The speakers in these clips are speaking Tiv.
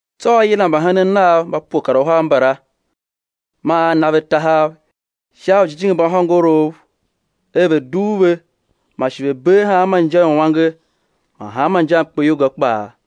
Tsô A yila mbahenen Nav mba pue kar uhar mbala, man A na ve ujijingi mba hôngorouv er ve̱ dugh ve, man shi ve̱ bee hanma inja uange man hanma inja i mkpeyolga kpaa.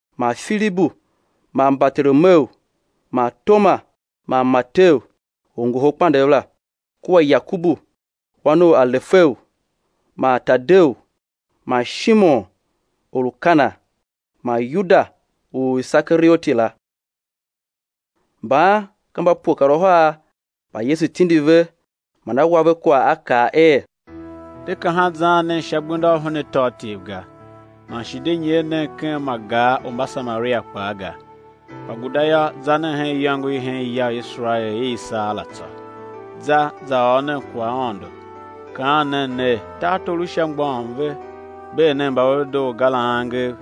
man Filibu kua Bartolomeu; man Toma man Mateu, orngoholkpandegh la, kua Yakobu, wan u Alefeu, man Tadeu; man Shimon, or u Kana, man Yuda u Isekarioti la. Mban ka mba pue kar uhar mba Yesu tindi ve, man A wa ve kwagh A kaa er: De kahan zaan nen sha gbenda u hen atôatyev ga, man shi de nyer nen ken ma gar u Mbasamaria kpaa ga. Kpa guda yô, za nen hen iyôngo i hen ya u Iserael i i saa la tsô. Za, za ôr nen kwaghaôndo, kaan nen ner: Tartor u Sha mgbôghom ve. Bee nen mba ve lu dedoo ga la angev;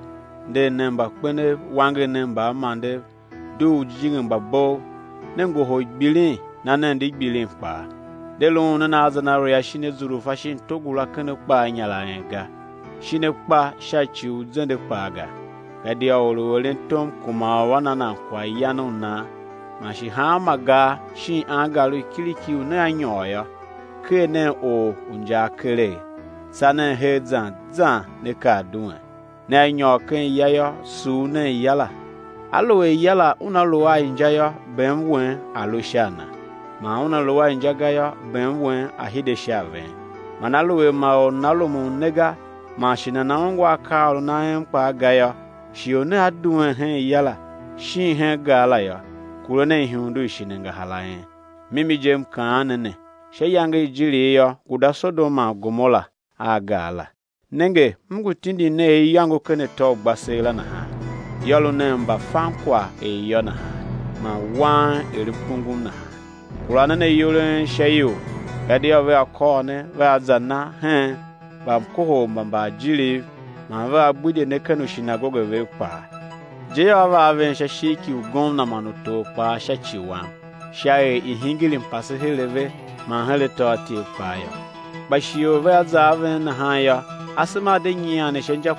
nder nen mbakpenev; wanger nen mbaamandev; dugh ujijingi mba bov. Ne ngohol gbilin, na nen di gbilin kpaa. De luun nen a zenaria shin azurfa shin togula ken akpa a inyar a en ga, shin akpa sha ci u zende kpaa ga, gadia or u eren tom kuma u á na nan kwaghyan u nan. Man shi hanma gar shin angar u kiriki u nea nyôr yô, ker nen or u injaa keregh, tsa nen her zan zan né kar duen. Nea nyôr ken ya yô, sugh nen ya la. Aluer ya la una lu a inja yô, bem wen a̱ lu sha a na; man una lu a inja ga yô, bem wen a̱ hide sha a ven. Man aluer ma or nana rumun ne ga, man shi nana ungwa akaaôron a en kpaa ga yô, shighe u nea duen hen ya la shin hen gar la yô, kure nen ihundu i shin angahar a en. Mimi je, M kaan ne ne, sha iyange i ijirigh yô, guda Sodom man Gomora a gar la. Nenge, M ngu tindin ne er iyôngo ken atô u ugbaseela nahan; yô, lu nen mbafankwagh er iyô nahan man wang er mkungum nahan. Kura nen ayol a en sha ior; gadia vea kôr ne vea za na hen mbamkohol mba mbaajiriv, man vea gbidye ne ken ushinagoge vev kpaa; je yô, á va a ven sha ishigh ki ugomna man utor kpaa sha ci Wam, sha er i̱ hingir mpase her a ve man her atôatyev kpaa yô. Kpa shighe u vea za a ven nahan yô, asema a̱ de nyian ne sha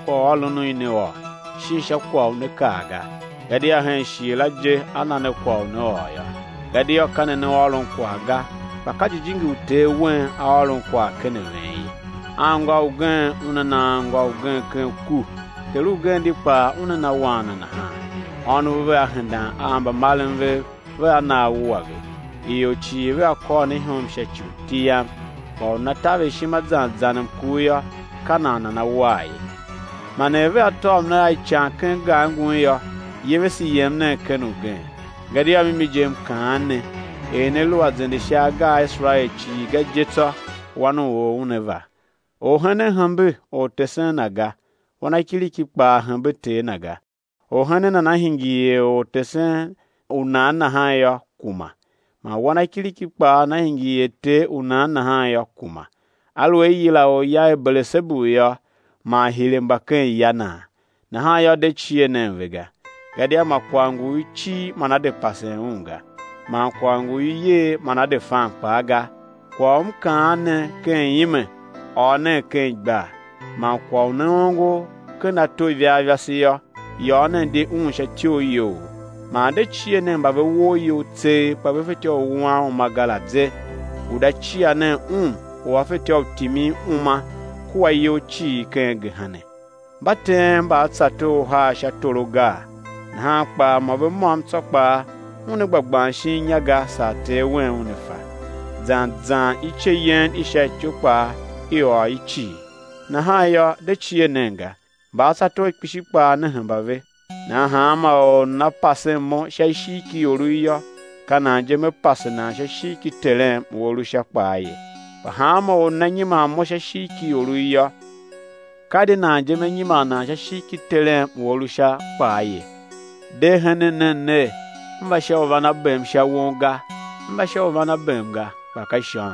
kwagh u né kaa ga, gadia hen shighe la je á na ne kwagh u né ôr yô. Gadia ka ne ne ôron kwagh ga, kpa ka Jijingi u Ter wen A ôron kwagh ken a ven ye. Anngô ugen una na anngô na ugen ken ku, ter ugen di kpaa una na wan na nahan; ônov vea hendan a mbamaren vev, vea na á wua ve. Ior cii vea kôr ne ihom sha ci u iti Yam; kpa u nana taver ishima zan zan mkur yô, ka nan nana war ye. Man er vea tôv ne a ican ken gar ngun yô, yevese, yem nen ken ugen; gadia mimi je M ngu kaan ne, er ne lu a zende sha agar a Iserael cii ga je tsô, Wan u or Una va. Orhenen hembe ortesen na ga; wanakiriki kpaa hembe ter na ga. Orhenen nana hingir er ortesen u nan nahan yô, kuma; man wanakiriki kpaa nana hingir er ter u nan nahan yô, kuma. Aluer i yila orya er, Belesebu yô, man hire mba ken ya naa? Nahan yô, de cie nen ve ga, gadia ma kwagh ngu u i cir man á de pasen un ga, man kwagh ngu u i yer man á de fan kpaa ga. Kwagh u M kaa ne ken ime, ôr nen ken igbar; man kwagh u ne ongo ken ato ivarivase yô, yôô nen di un sha ityoriyoughough. Man de cie nen mba ve woo iyol tseegh, kpa ve fetyô u wuan uma ga la ze; guda cia nen Un u A fetyô u timin uma kua iyol cii ken gehena. Mba teen mbaatsator uhar sha toro gaa? Nahan kpaa mô ve môm tsô kpaa una gba gban shin inya ga saa Ter wen Una fa. Zan zan ice yen i sha ityou kpaa, i ôr i cii. Nahan yô, de cie nen ga; mbaatsator kpishi kpaa ne hemba ve. Nahan hanma or u nana pasen Mo sha ishigh ki iorough yô, ka nan je Me pase nan sha ishigh ki Terem u A lu Sha kpaa ye. Kpa hanma or u nana nyiman Mo sha ishigh ki iorough yô, ka di nan je Me nyiman nan sha ishigh ki Terem u A lu Sha kpaa ye. De henen nen ner, M va sha u van a bem sha won ga; M va sha u van a bem ga, kpa ka ishôm.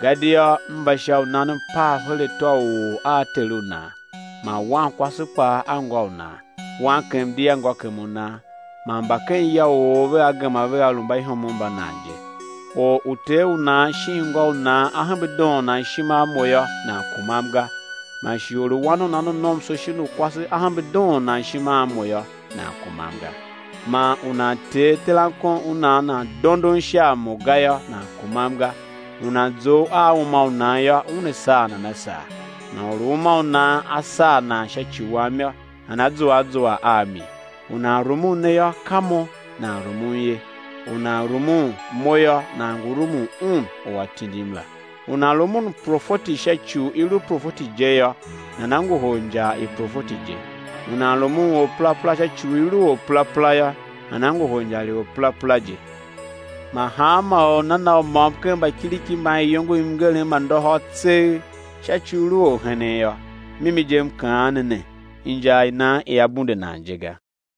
Gadia M va sha u nan mpav her atô u or a ter u nan, man wankwase kpaa a ngô u nan, wankem di a ngôkem u nan. Man mba ken ya u or vea gema vea lu mbaihomov mba nan je. Or u ter u nan shin ngô u nan a hembe doon nan ishima a Mo yô, nan kumam ga; man shi or u wan u nan u nomso shin u kwase a hembe doon nan ishima a Mo yô, nan kumam ga; man u nan tee terankon u nan, nan dondon sha a Mo ga yô, nan kumam ga. U nan zough a uma u nan yô, una saa nan a saa; man or u uma u nan a saa sha ci Wam yô, nana zua a zua a mi. U nan rumun ne yô, ka Mo, nan rumun ye; man u nan rumun Mo yô, nan ngu rumun Un u A tindim la. U nan rumun profeti sha ci u i lu profeti je yô, nana ngohol injar i profeti je; u nan rumun orperapera sha ci u i lu orperapera yô, nana ngohol injar i orperapera je. Man hanma or u nana na u môm ken mbakiriki mban iyongo i mngerem ma ndôhôr tseegh, sha ci u i lu orhenen yô, mimi je M kaa ne, injar i nan ia bunde nan je ga.